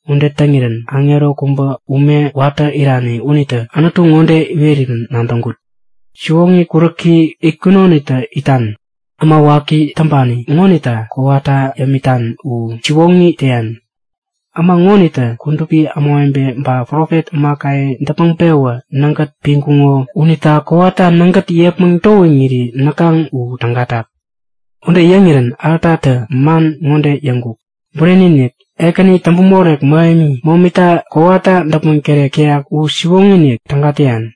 Ude täŋirän aŋero kubä ume watä irani unitä Anutu ŋode iwerirän nadäŋkut; Siwoŋi kuräki itkunonitä itan, Äma waki täŋpani ŋonita kowata yämitan u siwoŋi täyan. Äma ŋonitä kudupi ämawebe ba profet ämakaye däpmäŋ-pewä nägät piŋkuŋo unita kowata nägät yepmäŋ towiŋiri näkaŋ u tägatak. Ude yäŋirän altatä man ŋode yäŋkuk; Bureni-inik! Ekäni täŋpämorek mähemi, momita kowata däpmäŋ tärek täyan u siwoŋi-inik, täga täyan.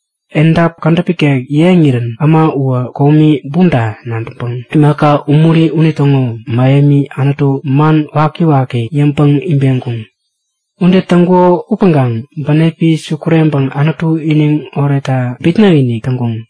Edap kädäp ikek yeŋirän äma uwä komi bumta nadäŋpäŋ imaka umuri unitäŋo mähemi Anutu, man wakiwaki yäŋpäŋ ibeŋkuŋ. Ude täŋkuŋo upäŋkaŋ bänepi sukureŋpäŋ Anutu iniŋ oretta bitnäk-inik täŋkuŋ.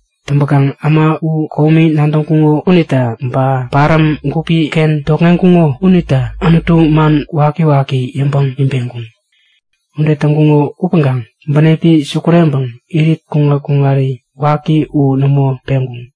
Täŋpäkaŋ äma u komi nadäŋkuŋo unita, ba paräm gupi-ken tokŋeŋkuŋo unita Anutu man wakiwaki yäŋpäŋ ibeŋkuŋ. Ude täŋkuŋo upäŋkaŋ bänepi sukureŋpäŋ irit kuŋat-kuŋari waki u nämo peŋkuŋ.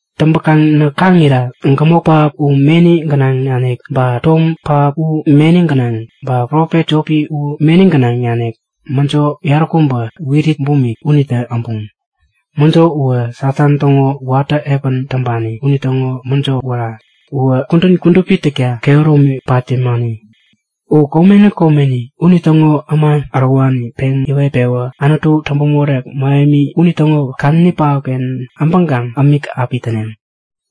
Täŋpäkaŋ näk kaŋira gämok pähap u meni gänaŋ nanik, ba tom pähap u meni gänaŋ, ba profet jopi u meni gänaŋ nanik mäjo yaräkubä wirit bumik unitä abuŋ. Mäjo uwä Satan täŋo watä epän täŋpani unitäŋo mäjo wära. Uwä kudän kudupi täkta kehäromi pat yämani. U komeni komeni unitäŋo äma ärowani peŋ yäwet-pewä Anutu Täŋpämorek Mähemi unitäŋo kadäni pähapken äbäŋkaŋ ämik api täneŋ.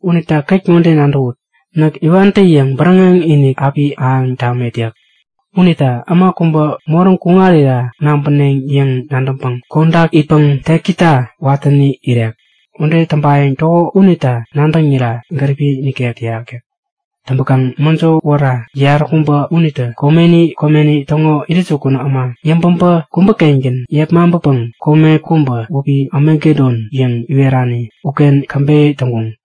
Unita ket ŋode nadäwut! Näk iwantä-yäŋ bäräŋek-inik api ahäŋ tamet yäk. Unita äma kubä moräŋ kuŋarira nabäneŋ yäŋ nadäŋpäŋ kodak itpäŋ tekita watäni irek. Ude täŋpayäŋ täko unita nadäŋira gäripi nikek täyak yäk. Täŋpäkaŋ mäjo wära yaräkubä unitä komeni komeni täŋo intäjukun äma yäŋpäbä kubä-kengän yepmaŋpäpäŋ kome kubä wäpi Amagedon yäŋ iwerani uken käbeyä täŋkuŋ.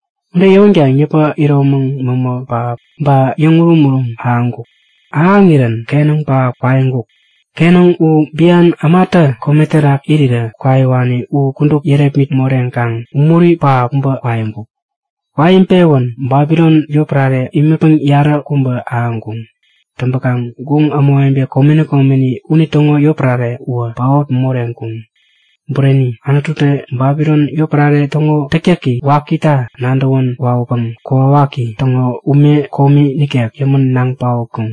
Ude yäwänkaŋ yäpä, iromäŋ mämä pähap ba yäŋ urum-urum ahäŋkuk. Ahäŋirän kenäŋ pähap kwaiŋkuk. Kenäŋ u bian ämatä kome terak irirä kwaiwani u kudup yärepmit moreŋkaŋ umuri pähap kubä kwaiŋkuk. Kwaiŋpewän Babilon yotpärare imätpäŋ yaräkubä ahäŋkuŋ. Täŋpäkaŋ guŋ ämawebe komeni komeni unitäŋo yotpärare uwä paot moreŋkuŋ. Bureni, Anututä Babilon yotpärare täŋo täktäki wakita nadäwän wawäpäŋ kokwawaki täŋo ume komi nikek yämän naŋ paotkuŋ.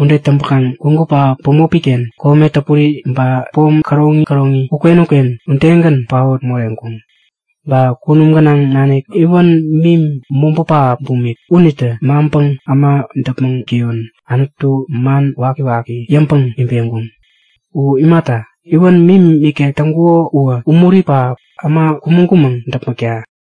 Ude täŋpänkaŋ gwägu pähap bämopi-ken kome täpuri, ba pom käroŋi käroŋi uken-uken udegän paot moreŋkuŋ. Ba kunum gänaŋ nanik iwän mim mobä pähap bumik unitä maŋpäŋ äma däpmäŋ täyon Anutu man wakiwaki yäŋpäŋ ibeŋkuŋ. U imata, iwän mim ikek taŋkuko uwä umuri pähap, äma kumäŋ-kumäŋ däpmäkta.